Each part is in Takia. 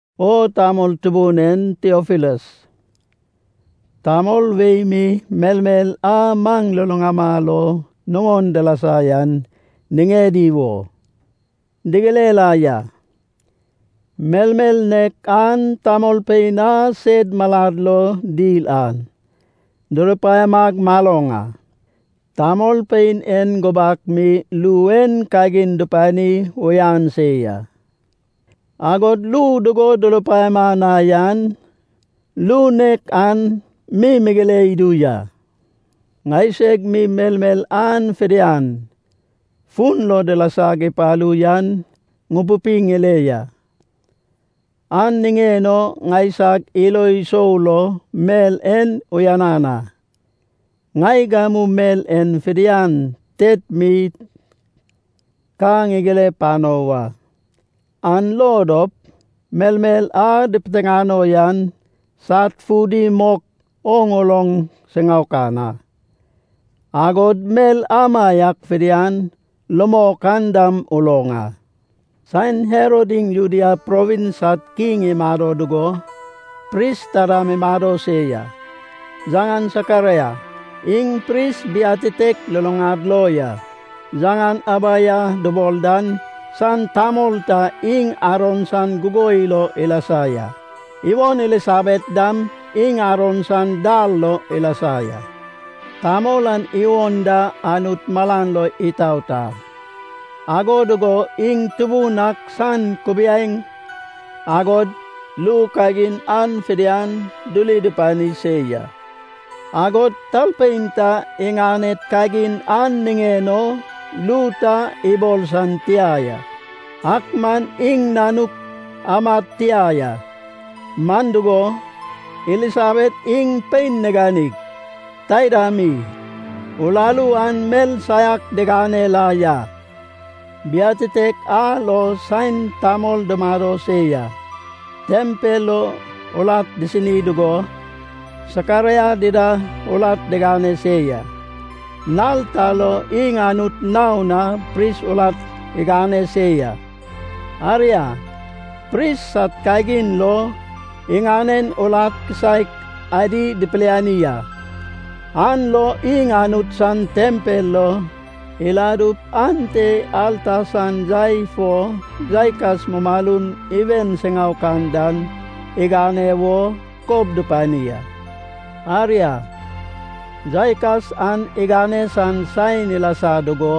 O tamol tubun en Tiofilas, tamol wei mi melmel a maŋ luluŋama lo nuŋon dilasa yan niŋedi wo digire la ya. Melmel nek an, tamolpein a sed malad lo dil an durupaiamag maloŋ a. Tamolpein en gubak mi ru en kagin dupani uyan se ya, agod ru dugo durupaiama na yan, ru nek an mi migire idu ya. Ŋaiseg mi melmel an fidian, fun lo dilasag ipalu yan ŋupupi ŋile ya. An niŋen o ŋaisag ilo sou lo mel en uyanan a, ŋai gamu mel en fidian tet mi ka ŋigire pano wa. An lo dop melmel a dipiteŋano yan sad fudi mok oŋ uloŋ siŋaokan a, agod mel amaiak fidian rumok an dam uloŋ a. Saen Herod iŋ Judea provins sad kiŋ imado dugo, pris ta dam imado se ya, yaŋan Sakaraia. Iŋ pris biatitek luluŋad lo a yaŋan Abaija dubol dan san tamol ta. Iŋ Aron san gugoi lo ilasa ya, iwon Elisabet dam iŋ Aron san dar lo ilasa ya. Tamol an iwon da Anut malan lo itaot a, ago dugo iŋ Tubun ak san kubiaeŋ agod ru kagin an fidian duri dupani se ya, agod talpein ta iŋaned kagin an niŋen o ru ta ibol san tia ya. Ak man iŋ nanuk amad tia ya. Man dugo, Elisabet iŋ pein niganig, taida mi, uraru an mel saiak digane la ya. Biatitek a lo, saen tamol dumado se yan tempel lo urat disini dugo, Sakaraia dida urat digane se ya. Nal ta lo iŋ Anut naon na pris urat igane se ya. Aria, pris sad kagin lo, iŋanen urat kisaek adi dipiliani a. An lo iŋ Anut san tempel lo iladup, ante alta san yai fo yaikas mumalum iwen siŋaokan dan igane wo, kob dupani a. Aria, yaikas an igane san saen ilasa dugo,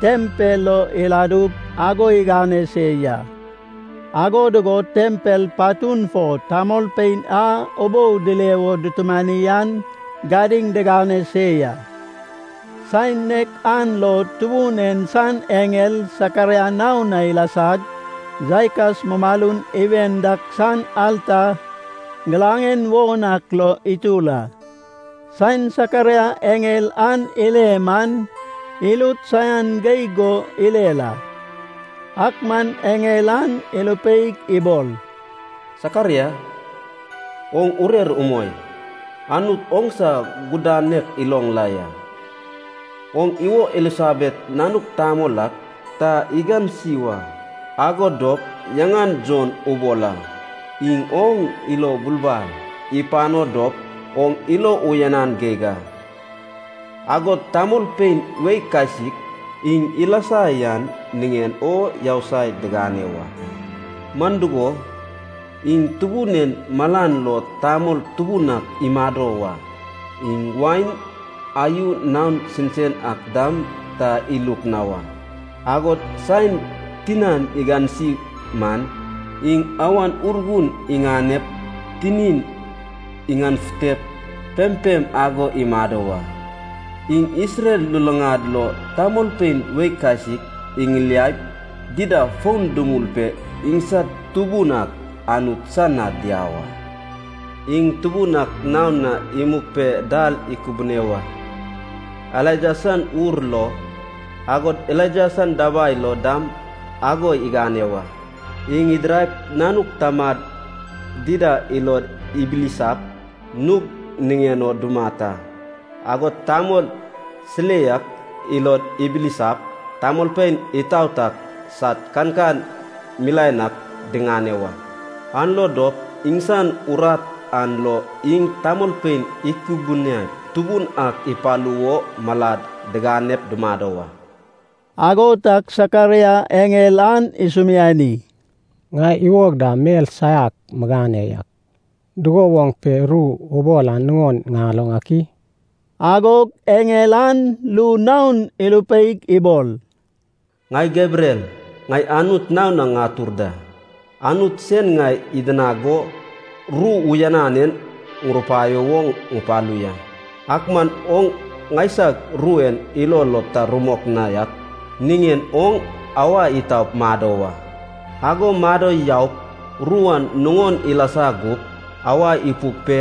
tempel lo iladug ago igane se ya, ago dugo tempel patun fo tamolpein a ubou dile wo dutumani an gadiŋ digane se ya. Saen nek an lo Tubun en san eŋel Sakaraia naon na ilasag, yaikas mumalun iwen dak san alta giraŋen won ak lo itur a. Saen Sakaraia eŋel an ile man, irut saian geig go irer a. Ak man eŋel an irupeig ibol, “Sakaraia, oŋ urer umoi. Anut oŋsa gudanek iloŋ la ya. Oŋ iwo Elisabet nanuk tamol ak ta igansi wa, ago dop yaŋan Jon ubol a. Iŋ oŋ ilo bulbal ipano dop oŋ ilo uyanan geig a. Agod tamolpein wei kasik iŋ ilasa yan niŋen o yousai digane wa. Man dugo, iŋ Tubun en malan lo tamol tubun ak imado wa. Iŋ wain, ayu naon sensen ak dam ta iluk na wa. Agod saen tinan igansi man, iŋ Awan Urgun iŋanep tinin iŋanefutep pempem ago imado wa. Iŋ Isrel luluŋad lo tamolpein wei kasik iŋiliaip, dida fon dumul pe iŋsad Tubun ak Anut san na diau a. Iŋ Tubun ak naon na imug pe dal ikubune wa. Elaija san ur lo, agod Elaija san dabai lo dam ago igane wa. Iŋ idiraip nanuk tamad dida ilod ibilisap, nug niŋen o dumat a, agod tamol silei ak ilod ibilisap, tamolpein itaot ak sad kankan milaen ak diŋane wa. An lo dop iŋsan urat an lo iŋ tamolpein ikubuniaip, Tubun ak ipalu wo malad diganep dumado wa.” Ago tag Sakaraia eŋel an isumiani, “Ŋai iwog da mel saiak migane ya. Dugo woŋ pe ru ubol an nuŋon ŋaloŋ ak i?” Agog eŋel an ru naon irupeig ibol, “Ŋai Gebriel. Ŋai Anut naon na ŋatur da. Anut sen ŋai idinag go, ru uyanan en ŋurupaio wo ŋupalu ya. Ak man oŋ ŋaisag ru en ilo lo ta rumok na yak niŋen oŋ awa itaup mado wa. Ago mado yaup ru an nuŋon ilasa gup, awa ipuk pe,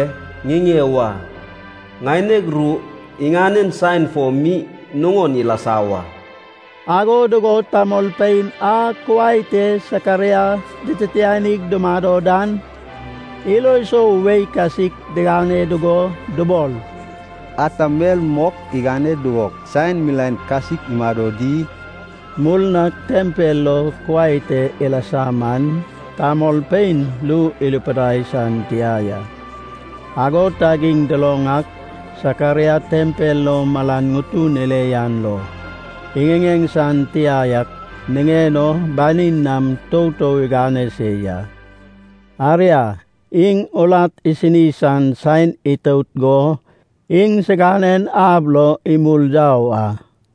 ŋiŋe wa. Ŋaineg ru iŋanen saen fo mi nuŋon ilasa wa.” Ago dugo tamolpein a kuai te Sakaraia dititianig dumado dan, ilo sou wei kasik digane dugo dubol, “Ata mel mok igane dugo saen milaen kasik imado di?” Murnag tempel lo kuai te ilasa man, tamolpein ru irupidai san tia ya. Ago tag iŋ duloŋ ak, Sakaraia tempel lo malan ŋutun ile yan lo, iŋiŋeŋ san tia yak niŋen o, banin nam toutou igane se ya. Aria, iŋ urat isini san saen itout go iŋsiganen ab lo imul yau a.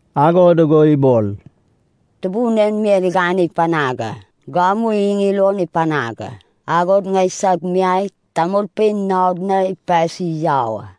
Ago dugo ibol, “Tubun en mel en igane panag a. Gamu iŋ ilon ipanag a, agod ŋaisag miai tamolpein naod na ipasi yau a.”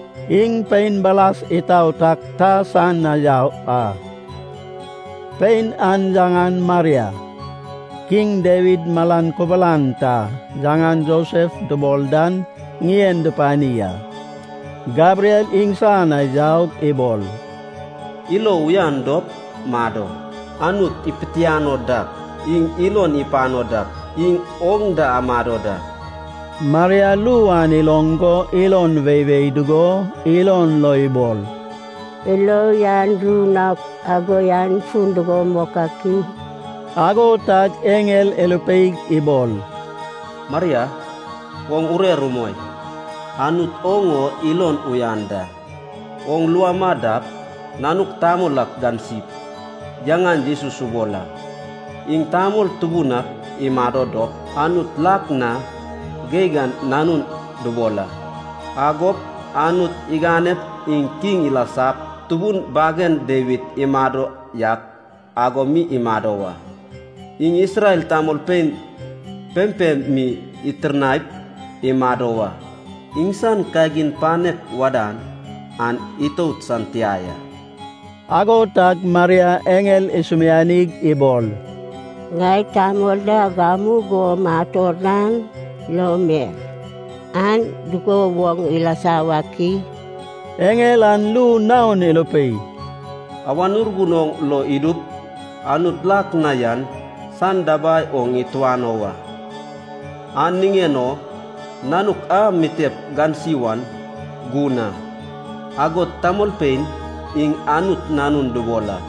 Iŋ pein baras itaot ak ta san na yau a. Pein an yaŋan Maria. King Dawid malan kubulan ta yaŋan Josef dubol dan ŋien dupani a. Gebriel iŋsan na yaug ibol, “Ilo uyan dop mado. Anut ipitiano dak, iŋ ilon ipano dak, iŋ oŋ da amado da.” Maria ru an iloŋ go ilon weiwei dugo ilon lo ibol, “Ilo uyan ru naok ago yan fun dugo mok ak i?” Ago tag eŋel irupeig ibol, “Maria, oŋ urer umoi. Anut oŋ o ilon uyan da. Oŋ lua ama dap, nanuk tamol ak gansip yaŋan Jesus ubol a. Iŋ tamol tubun ak imado dop, Anut lak na geig an Nanun dubol a. Agop, Anut iganep iŋ kiŋ ilasap, tubun bagen Dawid imado yak ago mi imado wa. Iŋ Isrel tamolpein pempem mi itirnaip imado wa. Iŋsan kagin panek wadan an itout san tia ya.” Ago tag Maria eŋel isumianig ibol, “Ŋai tamol da gamugo mator da, an lo mel an dugo woŋ ilasa wak i?” Eŋel an ru naon irupei, “Awan Urgun oŋ lo idup, Anut lak na yan san dabai oŋ ituano wa. An niŋen o nanuk a mitep gansi wan gun a, agod tamolpein iŋ Anut Nanun dubol a.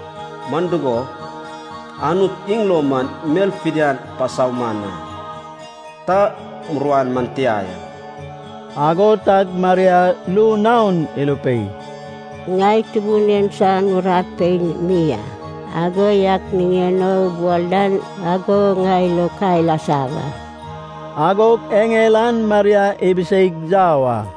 Man dugo, Anut iŋ lo man mel fidian pasauman a, ta muruan man tia ya.” Ago tag Maria ru naon irupei, “Ŋai Tubun en san urat pein mi a. Ago yak niŋen o ubol dan ago ŋai lo ka ilasa wa.” Agog eŋel an Maria ibiseig yau a.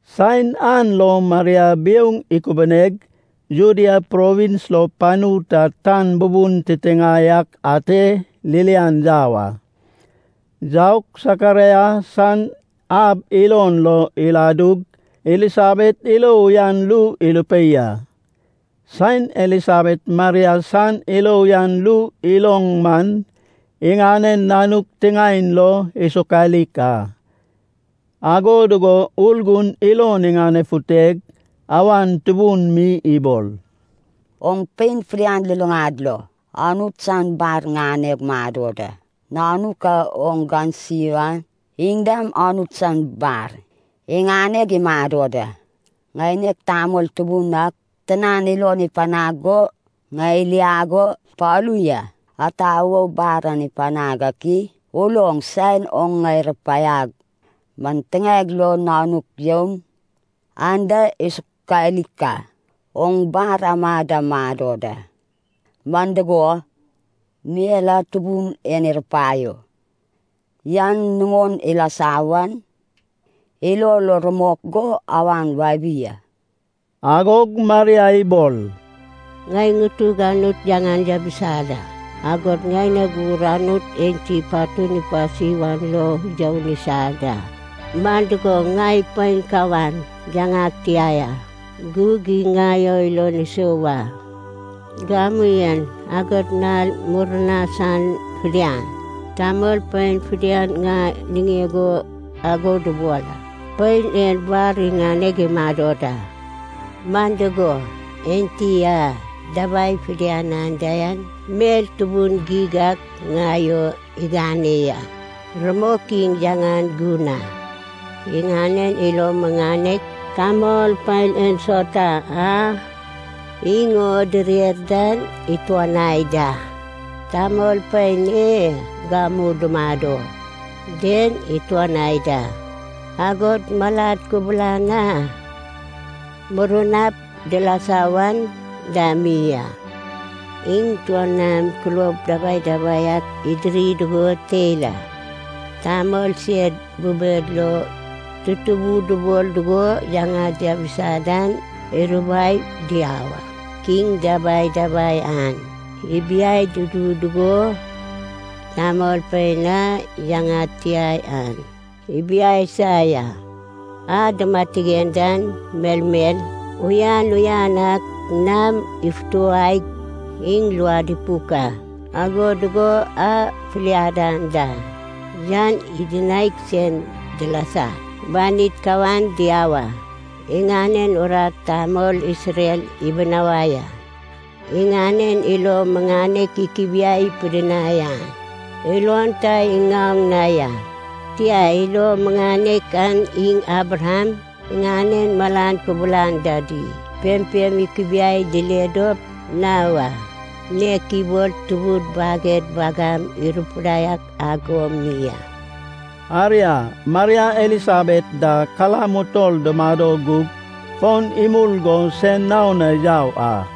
Saen an lo, Maria biouŋ ikubuneg, Judea Provins lo panu ta tan bubun titiŋae ak ate ririan yau a. Yaug, Sakaraia san ab ilon lo iladug, Elisabet ilo uyan ru irupei a. Saen Elisabet Maria san ilo uyan ru iloŋ man, iŋanen nanuk tiŋaen lo isokalik a, ago dugo Urgun ilon iŋanefuteg, awan tubun mi ibol, “Oŋ pein fidian luluŋad lo Anut san bar ŋaneg mado da. Nanuk a oŋ gansi wan iŋ dam Anut san bar iŋaneg imado da! Ŋaineg Tamol Tubun ak tinan ilon ipanag go, ŋai iliag o ipalu ya. Ata wo bar an ipanag ak i? Uloŋ, saen oŋ ŋai rupaiag man tiŋaeg lo nanuk youn anda isokalik a. Oŋ bar ama da mado da, man dugo, mel a Tubun en irupaio yan nuŋon ilasa wan ilo lo rumok go awan wabi a.” Agog Maria ibol: “Ŋai ŋutug Anut yaŋan yabisa da, agod ŋaineg ur Anut enti patug ipasi wan lo youn isa da. Man dugo, ŋai pein kawan, yaŋag tia ya. Gug iŋ ŋai o ilon isou a. Gamu en, agod nal murnai san fidian, tamolpein fidian ŋai niŋeg o ago dubol a, ‘Pein en bar iŋaneg imado da.’ Man dugo, Enti a dabai fidian anda yan, mel tubun geig ak ŋai o igane ya. Rumok, iŋ yaŋan gun a. Iŋanen ilo muŋanek, tamolpein ensauta a iŋ o direr dan ituanai da, tamolpein e gamu dumado den ituanai da, agod malad kubulan a murnap dilasa wan dam mi a. Iŋ tuon nam kulob dabdabai ak idiri dugo teil a, Tamol sed bubed lo tutubu dubol dugo yaŋad diabisa dan irubai diau a. Kiŋ dabdabai an ibiai dudu dugo, tamolpein a yaŋad tia yan ibiaisa ya. A dumatigen dan melmel uyan uyan ak nam ifutuwaig iŋ luad ipuk a. Ago dugo a filiad anda yan idinaig sen dilasag banid kawan diau a. Iŋanen urat tamol Isrel ibinawai a, iŋanen ilo muŋanek ikubiai pidinai an ilon ta iŋaoŋ na ya. Tia, ilo muŋanek an iŋ Abraham iŋanen malan kubulan dadi pempem ikubiaip dile dop na wa, nek ibol tubud baged wagam irupidai ak ago mi a.” Aria, Maria Elisabet da kalam utol dumado gug, fon imul go sen naon na yau a.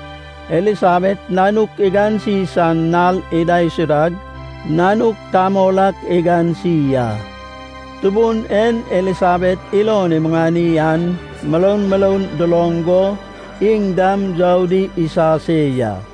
Elisabet nanuk igansi san nal idaisudag, nanuk tamol ak igansi a. Tubun en Elisabet ilon imuŋani an muroun muroun duloŋ go iŋ dam youdi isa se ya.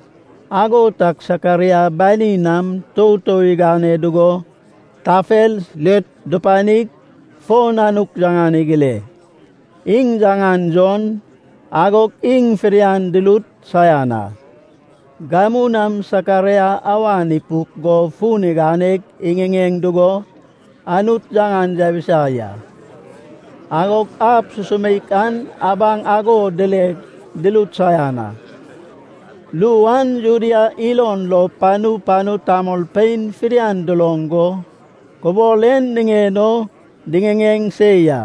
Ago tag Sakaraia banin nam toutou igane dugo tafel (slet) dupanig, fo nanuk yaŋan igire: “Iŋ yaŋan Jon.” Agog iŋ fidian durut saian a. Gamu nam Sakaraia awan ipuk go fun iganeg iŋiŋeŋ dugo, Anut yaŋan yabisa ya. Agog ab susumeik an abaŋ ago dileg, durut saian a. Ru an Judea ilon lo panu panu tamolpein fidian duloŋ go, kubol en niŋen o diŋiŋeŋ se ya.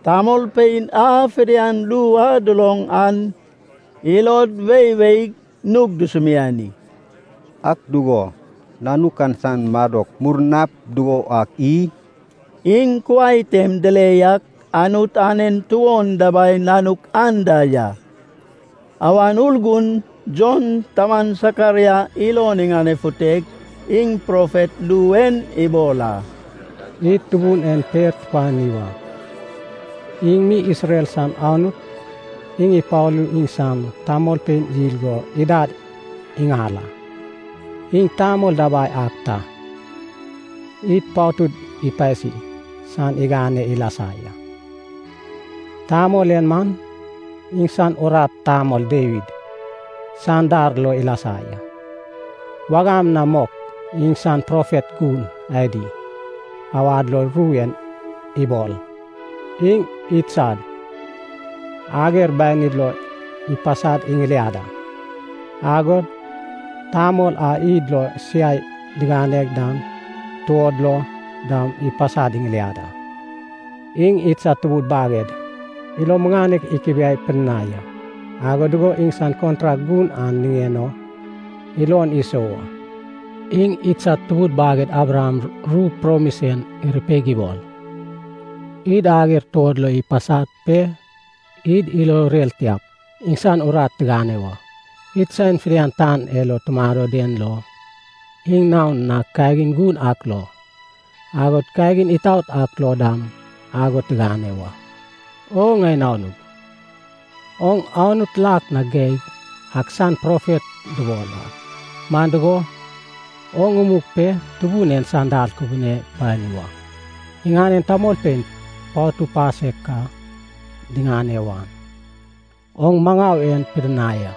Tamolpein a fidian ru a duloŋ an ilod weiweig nug dusumiani, “Ak dugo, nanuk an san madok murnap dugo wak i?” Iŋ kuai tem dile yak Anut anen tuon dabai nanuk an da ya. Awan Urgun Jon taman Sakaraia ilon iŋanefuteg, iŋ profet ru en ibol a, “Id Tubun en per tupani wa, iŋ mi Isrel san Anut. Iŋ ipalug iŋsan tamolpein yil go idad iŋal a. Iŋ tamol dabai ak ta, id patud ipasi san igane ilasa ya. Tamol en man, iŋsan urat tamol Dawid san dar lo ilasa ya. Wagam na mok iŋsan profet gun adi awad lo ru en ibol: Iŋ idsad ager banid lo ipasad iŋiliad a. Agod tamol a id lo siai digane dan tuod lo dam ipasad iŋiliad a. Iŋ idsad tubud baged ilo muŋanek ikubiai pidinai a. Ago dugo iŋsan kontrak gun an niŋen o ilon isou a. Iŋ idsad tubud baged Abraham ru promis en irupeig ibol: Id ager tuod lo ipasad pe id ilo urer tiap, iŋsan urat tigane wa. Id saen fidian tan e lo tumado den lo, iŋ naon na kagin gun ak lo, agod kagin itaot ak lo dam ago tigane wa. O ŋai nanug, oŋ Anut lak na geig ak san profet dubol a. Man dugo, oŋ umug pe Tubun en san dal kubune pani wa. Iŋanen tamolpein patu pasek ka diŋane wan, oŋ maŋau en pidinai a,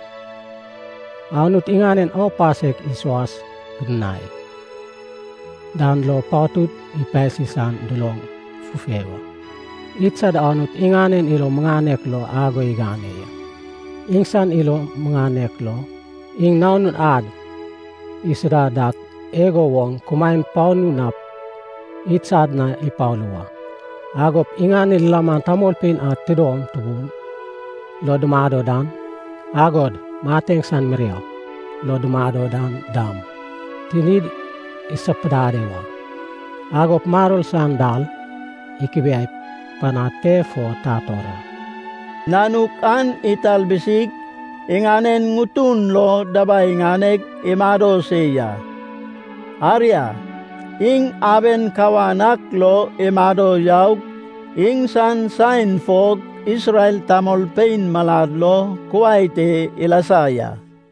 Anut iŋaned aupasek isuas pidinai dan lo patud ipasi san duloŋ fufei a. Idsad Anut iŋanen ilo muŋanek lo ago igane ya. Iŋsan ilo muŋanek lo, iŋ Nanun ad isuda dak igo woŋ kumaen panu nap idsad na ipalu wa. Agop iŋanen lilaman tamolpein a tidom tubun lo dumado dan, agod mateŋ san mirau lo dumado dan dam, tinid isapudade wa. Agop maror san dal ikubiai panad pe fo tator a.” Nanuk an italbusig iŋanen ŋutun lo dabai iŋaneg imado se ya. Aria, iŋ aben kawan ak lo imado yaug, iŋsan saen fog Isrel tamolpein malad lo kuai te ilasa ya.